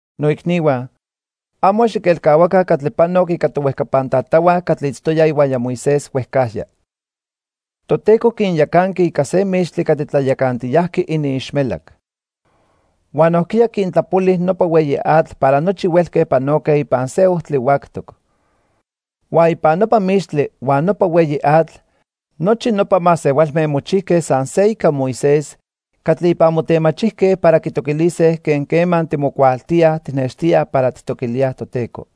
Noicnihua, amo xiquelcahuaca catli panoc ica tohuejcapan tatahua catli itztoyaj ihuaya Moisés huejcajya. Toteco quinyacanqui ica se mixtli catli tlayacantiyajqui iniixmelac. Huan nojquiya quintlapoli nopa hueyi atl para nochi huelque panoque ipan se ojtli huactoc. Huan ipan nopa mixtli huan nopa hueyi atl, nochi nopa masehualme mochijque san se ica Moisés catli ipan motemachijque para quitoquilise quen quema timocuaaltíaj tijnextíaj para tijtoquilíaj Toteco.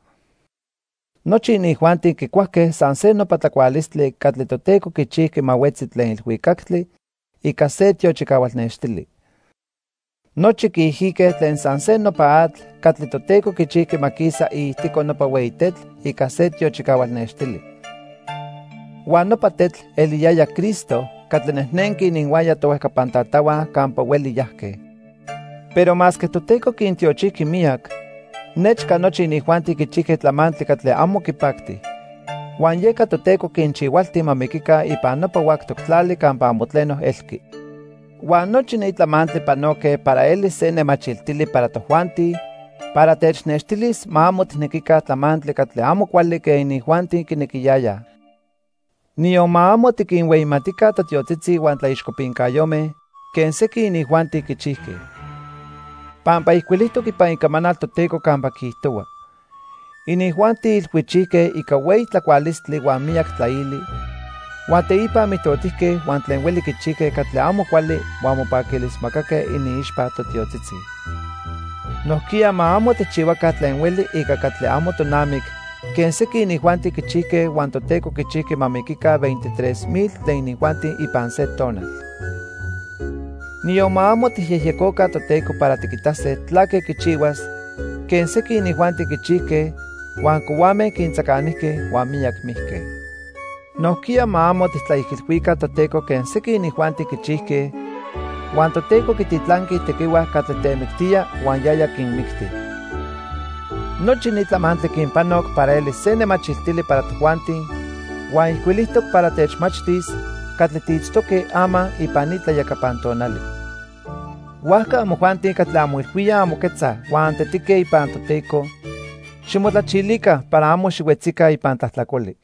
Nochi inijuanti quicuajque san se nopa tlacualistli catli Toteco quichijqui ma huetzi tlen ilhuicactli ica se tiochicahual nextili. Nochi quiijique tlen san se nopa atl catli Toteco quichijqui ma quisa iijtico nopa hueyi tetl ica se tiochicahual nextili. Huan nopa tetl eliyaya Cristo catli nejnenqui ininhuaya tohuejcapan tatahua campa hueli yajque. Pero masque Toteco quintiochijqui miyac, nechca nochi inijuanti quichijque tlamantli catli amo quipacti. Huan yeca Toteco quinchihualti ma miquica ipan nopa huactoc tlali campa amo tleno elqui. Huan nochi ni tlamantli panoque para elis se nemachiltili para tojuanti para technextilis ma amo tijnequica tlamantli catli amo cuali quen inijuanti quinequiyayaj. Niyon ma amo tiquinhueyimatica totiotzitzi huan tlaixcopincayome quen sequin inijuanti quichijque. Pampa ijcuilijtoc ipan Icamanal Toteco campa quiijtohua: "Inijuanti ilhuichijque ica hueyi tlacualistli huan miyac tlaili, huan teipa mijtotijque huan tlen hueli quichijque catli amo cuali huan mopaquilismacaque iniixpa totiotzitzi." Nojquiya ma amo tijchihuaca tlen hueli ica catli amo tonamic quen sequin inijuanti quichijque huan Toteco quichijqui ma miquica veintitrés mil tlen inijuanti ipan se tonal. Niyon ma amo tijyejyecoca Toteco para tiquitase tlaque quichihuas quen sequin inijuanti quichijque huan cohuame quintzacanijque huan miyac mijque. Nojquiya ma amo tijtlaijilhuica Toteco quen sequin inijuanti quichijque huan Toteco quititlanqui itequihua catli temictía huan yaya quinmicti. Nochi ni tlamantli quinpanoc para elis se nemachiltili para tojuanti huan ijcuilijtoc para techmachtis catli tiitztoque ama ipan ni tlayacapan tonali. Huajca amojuanti catli anmoilhuíaj anmoquetzaj huan antetique ipan Toteco, ximotlachilica para amo xihuetzica ipan tlajtlacoli.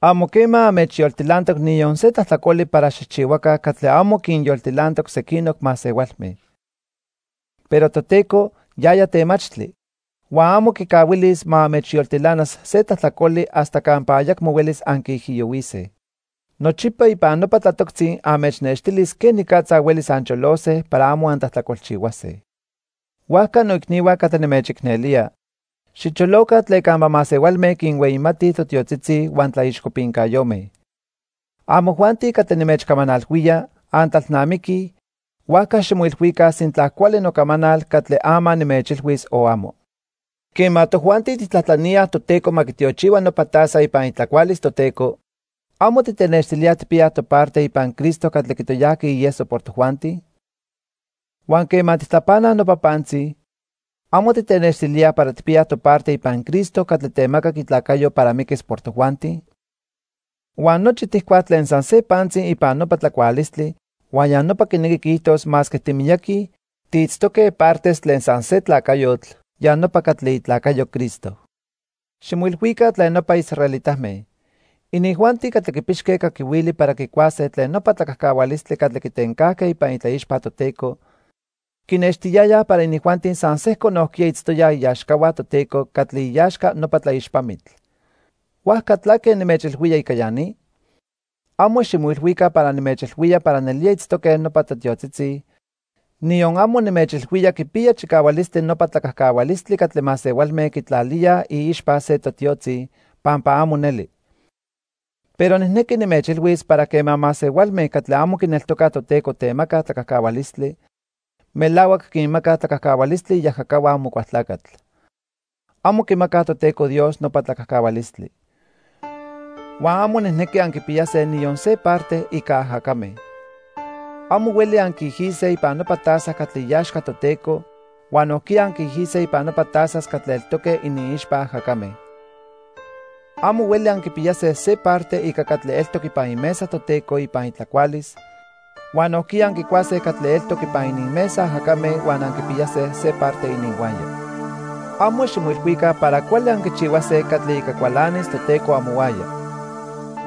Amo quema anmechyoltilantoc niyon se tlajtlacoli para xijchihuaca catli amo quinyoltilantoc sequinoc masehualme. Pero Toteco, yaya temachtli, huan amo quicahuilis ma anmechyoltilanas se tlajtlacoli hasta campa ayacmo huelis anquiijiyohuise. Nochipa ipan nopa tlatoctzi anmechnextilis quenicatza huelis ancholose para amo antlajtlacolchihuase. Huajca noicnihua catli nimechicnelía, xicholoca tlen campa masehualme quinhueyimatij totiotzitzi huan tlaixcopincayome. Amojuanti catli nimechcamanalhuía, antlalnamiquij, huajca ximoilhuica sintla cuali nocamanal catli ama nimechilhuis o amo. Quema tojuanti tijtlajtlaníaj Toteco ma quitiochihua nopa taza ipan itlacualis Toteco, ¿amo titenextilíaj tijpiyaj toparte ipan Cristo catli quitoyajqui ieso por tojuanti? Huan quema tijtlapanaj nopa pantzi, ¿amo titenextilíaj para tijpiyaj toparte ipan Cristo catli temacac itlacayo para miquis por tojuanti? Huan nochi tijcuaj tlen san se pantzi ipan nopa tlacualistli huan ya nopa quinequi quiijtos masque timiyaqui, tiitztoque partes tlen san se tlacayotl, ya nopa catli itlacayo Cristo. Ximoilhuica tlen nopa israelitame. Inijuanti catli quipixque caquihuili para quicuase tlen nopa tlacajcahualistli catli quitencajque ipan itlaixpa Toteco, quinextiyayaj para inijuanti san sejco nojquiya itztoyaj iaxcahua Toteco catli iaxca nopa tlaixpamitl. ¿Huajca tlaque nimechilhuía ica ya ni? Amo ximoilhuica para nimechilhuía para nelía itztoque nopa totiotzitzi, niyon amo nimechilhuía quipiya chicahualistli nopa tlacajcahualistli catli masehualme quitlalíaj iixpa se totiotzi, pampa amo neli. Pero nijnequi nimechilhuis para quema masehualme catli amo quineltocaj Toteco temacaj tlacajcahualistli, melahuac quinmacaj tlacajcahualistli iajacahua Amocualtlacatl. Amo quimacaj Toteco Dios nopa tlacajcahualistli. Huan amo nijnequi anquipiyase niyon se parte ica ajacame. Amo hueli anquiijise ipan nopa taza catli iaxca Toteco huan nojquiya anquiijise ipan nopa tazas catli eltoque iniixpa ajacame. Amo hueli anquipiyase se parte ica catli eltoc ipan imesa Toteco ipan itlacualis huan nojquiya anquicuase catli eltoc ipan ininmesa ajacame huan anquipiyase se parte ininhuaya. Amo ximoilhuica para cuali anquichihuase catli ica cualanis Toteco amohuaya.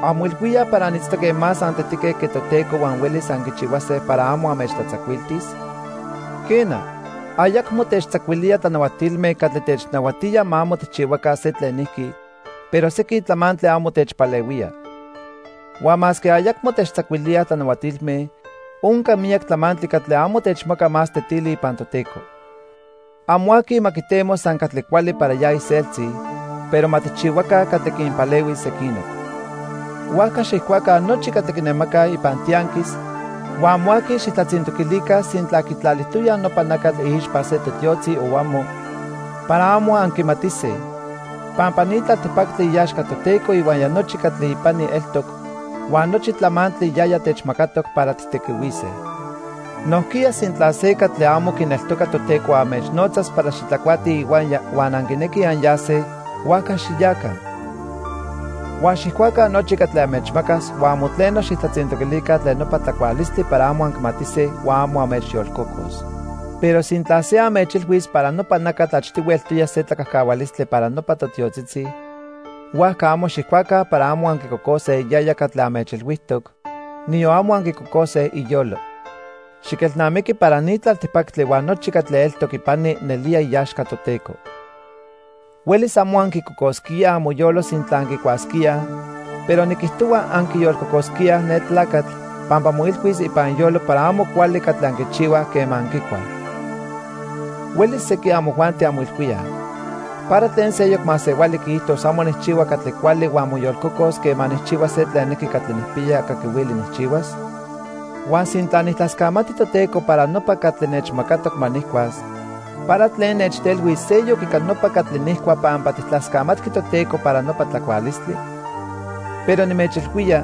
¿Anmoilhuíaj para anitztoque más antetique que Toteco huan huelis anquichihuase para amo anmechtlatzacuiltis? Quena, ayacmo techtzacuilía tlanahuatilme catli technahuatía ma amo tijchihuaca se tlenijqui, pero sequin tlamantli amo techpalehuía. Huan masque ayacmo techtzacuilíaj tlanahuatilme, onca miyac tlamantli catli amo techmaca más tetili ipan Toteco. Amo aqui ma quitemo san catli cuali para ya iseltzi, pero ma tijchihuaca catli quinpalehuis sequinoc. Huajca xijcuaca nochi catli quinemacaj ipan tianquis huan amo aqui xijtlatzintoquilica sintla quitlalijtoyaj nopa nacatl iixpa se totiotzi o amo, para amo anquimatise, pampa ni tlaltipactli iaxca Toteco ihuaya nochi catli ipani eltoc huan nochi tlamantli yaya techmacatoc para tijtequihuise. Nojquiya sintla se catli amo quineltoca Toteco anmechnotzas para xitlacuatij ihuaya huan anquinequij anyase, huajca xiyaca. Huan xijcuaca nochi catli anmechmacas huan amo tleno xijtlatzintoquilica tlen nopa tlacualistli para amo anquimatise huan amo anmechyolcocos. Pero sintla se anmechilhuis para nopa nacatl achtihui eltoya se tlacajcahualistli para nopa totiotzitzi, huajca amo xijcuaca para amo anquicocose yaya catli anmechilhuijtoc, niyon amo anquicocose iyolo. Xiquelnamiqui para ni tlaltipactli huan nochi catli eltoc ipani nelía iaxca Toteco. Huelis amo anquicocosquíaj amoyolo sintla anquicuasquíaj, pero niquijtohua anquiyolcocosquíaj ne tlacatl pampa moilhuis ipan iyolo para amo cuali catli anquichihuaj quema anquicuaj. Huelis sequin amojuanti anmoilhuíaj: "¿Para tlen seyoc masehuali quiijtos amo nijchihua catli cuali huan moyolcocos quema nijchihua se tlenijqui catli nijpiya caquihuili nijchihuas? Huan sintla nijtlascamati Toteco para nopa catli nechmacatoc ma nijcuas, ¿para tlen nechtelhuis seyoc ica nopa catli nijcua pampa tijtlascamatqui Toteco para nopa tlacualistli?" Pero nimechilhuía,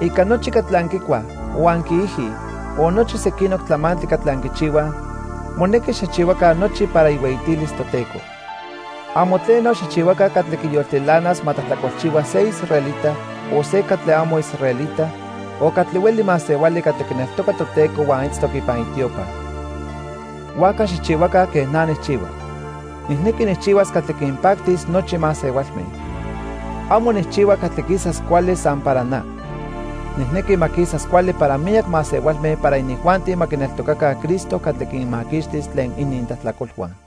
ica nochi catli anquicuaj, o anquiijij o nochi sequinoc tlamantli catli anquichihuaj, monequi xijchihuaca nochi para ihueyitilis Toteco. Amo tleno xijchihuaca catli quiyoltilanas ma tlajtlacolchihua se israelita, o se catli amo israelita o catli hueli masehuali catli quineltoca Toteco huan itztoc ipan itiopa. Huajca xijchihuaca quen na nijchihua. Nijnequi nijchihuas catli quinpactis nochi masehualme. Amo nijchihua catli quisas cuali san para na. Nijnequi ma quisas cuali para miyac masehualme para inijuanti ma quineltocaca Cristo catli quinmaquixtis tlen inintlajtlacolhua.